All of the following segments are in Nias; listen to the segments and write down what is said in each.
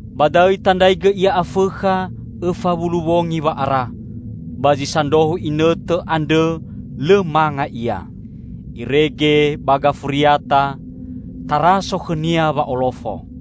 Ba da'õ itandraigõ Ia Afõkha õfa wulu wongi wa'ara. Ba zi sandrohu inõtõ andrõ lõ manga Ia. Irege ba gafuriata taraso khõ-Nia wa'olofo.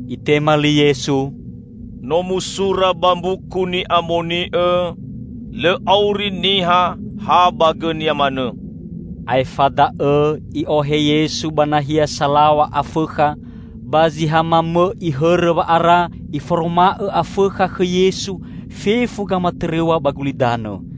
Itema li Yesu, "No musura ba Mbuku Ni'amoni'õ, 'Lõ auri niha ha ba gõnia manõ.'" Aefa da'õ i'ohe Yesu ba nahia salaw̃a Afõkha, ba zi ha mamõ'i hõrõ wa'ara iforoma'õ Afõkha khõ Yesu fefu gamatõrõw̃a ba gulidanõ.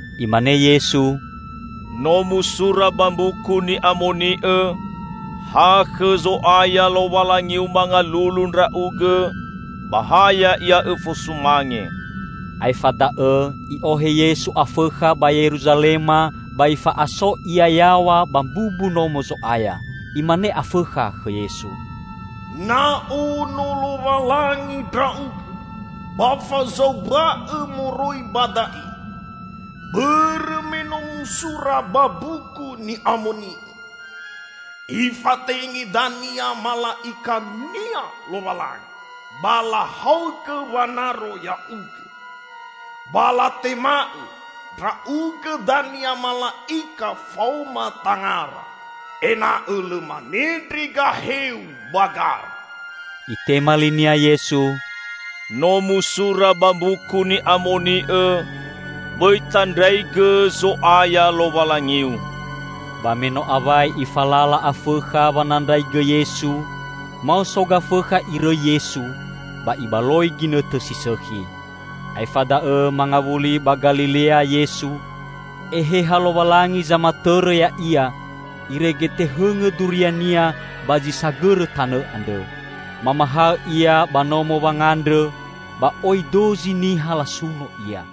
Imane Yesu, "No musura ba Mbuku Ni'amoni'õ, 'Ha khõ Zo'aya Lowalangiu mangalulu ndra'ugõ, ba ha Ya'ia õfasumange!'" Aefa da'õ i'ohe Yesu Afõkha ba Yeruzalema ba ifa'aso Ia yaw̃a ba mbumbu Nomo Zo'aya. Imane afõkha khõ Yesu, "Na ono Lowalangi Ndra'ugõ, ba fazaumba'õ moroi ba da'e. Bõrõ me no musura ba Mbuku Ni'amoni'õ, 'Ifatenge dania mala'ika-Nia Lowalangi, ba lahaogõ wanaro Ya'ugõ.' Ba latema'õ, 'Ndra'ugõ dania mala'ika faoma tangara, ena'õ lõ manendre gahe-U ba gara!'" Itema linia Yesu, "No musura ba Mbuku Ni'amoni'õ, 'Bõi tandraigõ, Zo'aya, Lowalangiu.'" Ba me no awai ifalala Afõkha wanandraigõ Yesu, maoso Gafõkha irõi Yesu, ba ibaloi ginõtõ si sõkhi. Aefa da'õ mangawuli ba Galilea Yesu. Eheha Lowalangi zamatõrõ Ya'ia, irege tehõngõ duria-Nia ba zi sagõrõ tanõ andrõ. Mamahaõ Ia ba nomo wangandrõ, ba oi dozi niha lasuno Ia.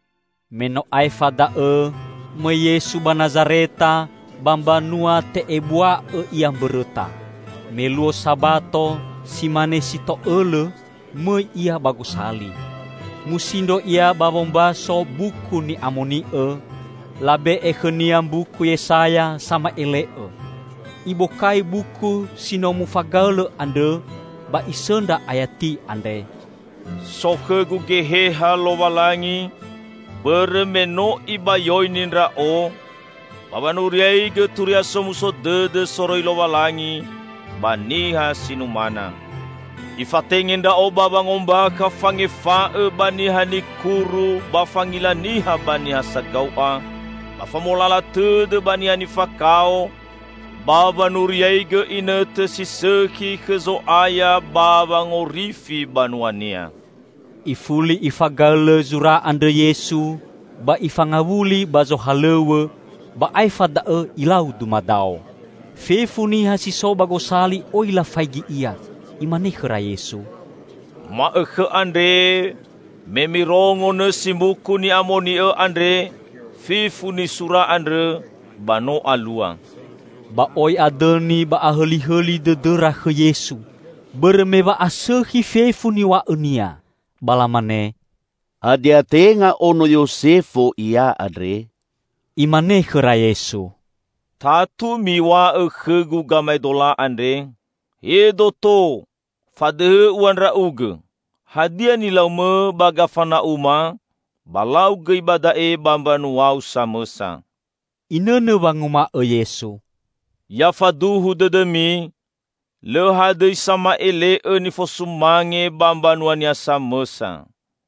Me no aefa da'õ mõi Yesu ba Nazareta, ba mbanua te'ebua'õ Ia mbõrõta. Me luo Sabato, si mane si to'õlõ, mõi Ia ba gosali. Musindro Ia ba wombaso Buku Ni'amoni'õ, labe'e khõ-Nia mbuku Yesaya sama'ele'õ. Ibokai buku si no mufagaõlõ andrõ, ba Isõndra ayati andre, "So khõ-Gu geheha Lowalangi, bõrõ me no Ibayoini Ndra'o, ba wanuriaigõ Turia Somuso Dõdõ soroi Lowalangi ba niha si numana. Ifatenge Ndra'o ba wangombakha fangefa'õ ba niha nikuru ba fangila niha ba niha sagau'a; ba famolala tõdõ ba niha nifakao, ba wanuriaigõ inõtõ si sõkhi khõ Zo'aya ba wangorifi banua-Nia." Ifuli Ifagaõlõ zura andrõ Yesu, ba Ifangawuli ba zohalõw̃õ, ba aefa da'õ Ilau dumadao. Fefu niha si so ba gosali oi lafaigi Ia. Imane khõra Yesu, "Ma'õkhõ andre, me mirongo nõsi Mbuku Ni'amoni'õ andre, fefu nisura andrõ ba no alua." Ba oi adõni ba ahõlihõli dõdõra khõ Yesu, bõrõ me wa'asõkhi fefu niw̃a'õ-Nia. Ba lamane, "Hadia tenga ono Yosefo Ia andre?" Imane khõra Yesu, "Tatu miw̃a'õ khõ-Gu gamaedola andre, 'He doto, fadõhõ ua Ndra'ugõ. Hadia nilau-Mõ ba Gafana'uma, ba lau gõi ba da'e ba mbanua-U samõsa.'" Inõnõ wanguma'õ Yesu, "Ya faduhu dõdõmi, lõ hadõi sama'ele'õ nifosumange ba mbanuania samõsa.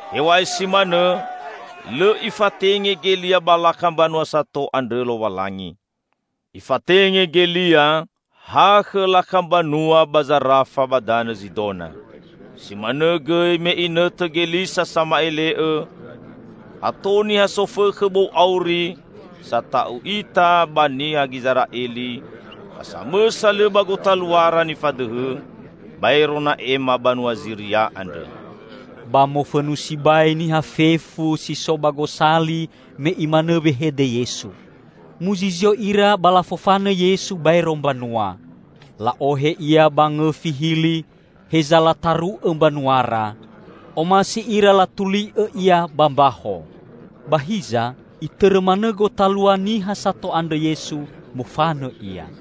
Hew̃a'ae si manõ, lõ Ifatenge Gelia ba lakha mbanua sato andrõ Lowalangi. Ifatenge Gelia ha khõ lakha mbanua ba Zarafa ba danõ Zidona. Si manõ gõi me inõtõ Gelisa sama'ele'õ, ato niha sofõkhõ bou auri sata'u ita ba niha Gizera'eli, ba samõsa lõ ba gotaluara nifadõhõ, baero Na'ema banua Ziria andrõ." Ba mofõnu sibai niha fefu si so ba gosali me Imanõ wehede Yesu. Muzizio ira ba lafofanõ Yesu baero mbanua. La'ohe Ia ba ngõfi hili, heza lataru'õ mbanuara. Omasi ira latuli'õ Ia ba mbaho. Ba hiza, Itõrõ manõ gotalua niha sato andrõ Yesu, mofanõ Ia.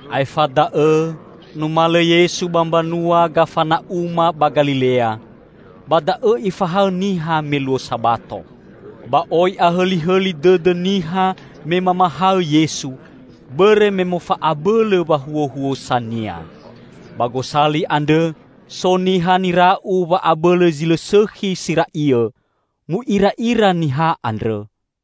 Aefa da'õ numalõ Yesu ba mbanua Gafana'uma ba Galilea. Ba da'õ Ifahaõ niha me luo Sabato. Ba oi ahõlihõli dõdõ niha me mamahaõ Yesu, bõrõ me mofa'abõlõ wahuhuosa-Nia. Ba gosali andrõ so niha nira'u wa'abõlõ zi lõ sõkhi si ra'iõ. Mu'ira'ira niha andrõ,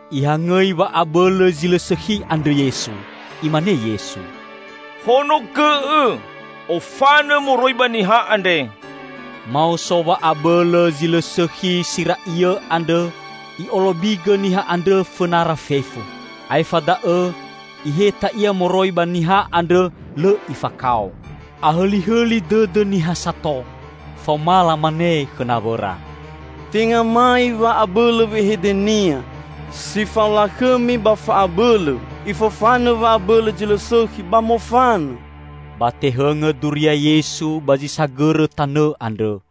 Ihangõi wa'abõlõ zi lõ sõkhi andrõ Yesu. Imane Yesu, "Honogõ'õ! Ofanõ moroi ba niha andre!" Maoso wa'abõlõ zi lõ sõkhi si ra'iõ andrõ i'olobigõ niha andrõ fõnara fefu, aefa da'õ iheta ia moroi ba niha andrõ lõ ifakao. Ahõlihõli dõdõ niha sato. Faoma lamane khõ nawõra, "Tenga mai wa'abõlõ wehede-Nia. Si fao lakhõmi ba fa'abõlõ, Ifofanõ wa'abõlõ zi lõ sõkhi, ba mofanõ!" Ba tehõngõ duria Yesu ba zi sagõrõ tanõ andrõ.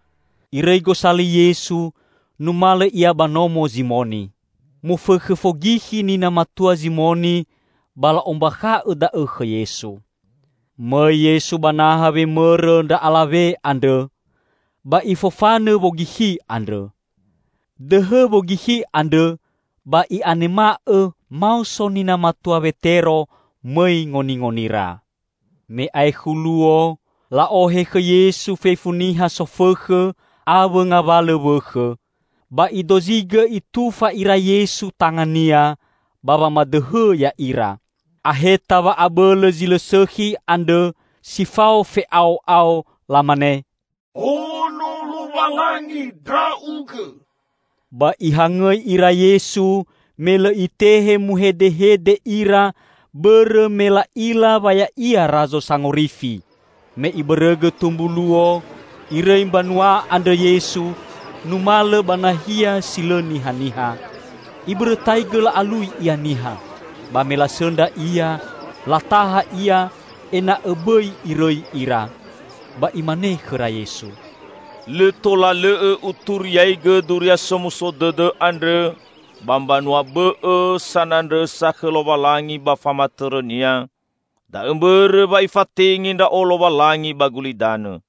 Irõi gosali Yesu, numalõ Ia ba nomo Zimoni. Mofõkhõ fogikhi nina matua Zimoni, ba la'ombakha'õ da'õ khõ Yesu. Mõi Yesu ba naha wemõrõ ndra alawe andrõ, ba Ifofanõ wogikhi andrõ. Dõhõ wogikhi andrõ ba i'anema'õ maoso nina matua Wetero mõi ngoningonira. Me aekhu luo, la'ohe khõ Yesu fefu niha sofõkhõ, awõ ngawalõ wõkhõ. Ba Idozigõ Itufa ira Yesu tanga-Nia ba wamadõhõ ya'ira. Aheta wa'abõlõ zi lõ sõkhi andrõ si fao fe'ao'ao, lamane, "Ono Lowalangi Ndra'ugõ!" Ba Ihangõi ira Yesu, me lõ Itehe muhedehede ira, bõrõ me la'ila wa Ya'ia Razo Sangorifi. Me ibõrõgõ tumbu luo, Irõi mbanua andrõ Yesu numalõ ba nahia si lõ nihaniha. Ibõrõtaigõ la'alui Ia niha. Ba me lasõndra Ia, lataha Ia ena'õ bõi Irõi ira. Ba Imane khõra Yesu, "Lõ tola lõ'õ Uturiaigõ Duria Somuso Dõdõ andrõ ba mbanua bõ'õ sanandrõsa khõ Lowalangi ba famatõrõ-Nia, da'õ mbõrõ wa Ifatenge Ndra'o Lowalangi ba gulidanõ."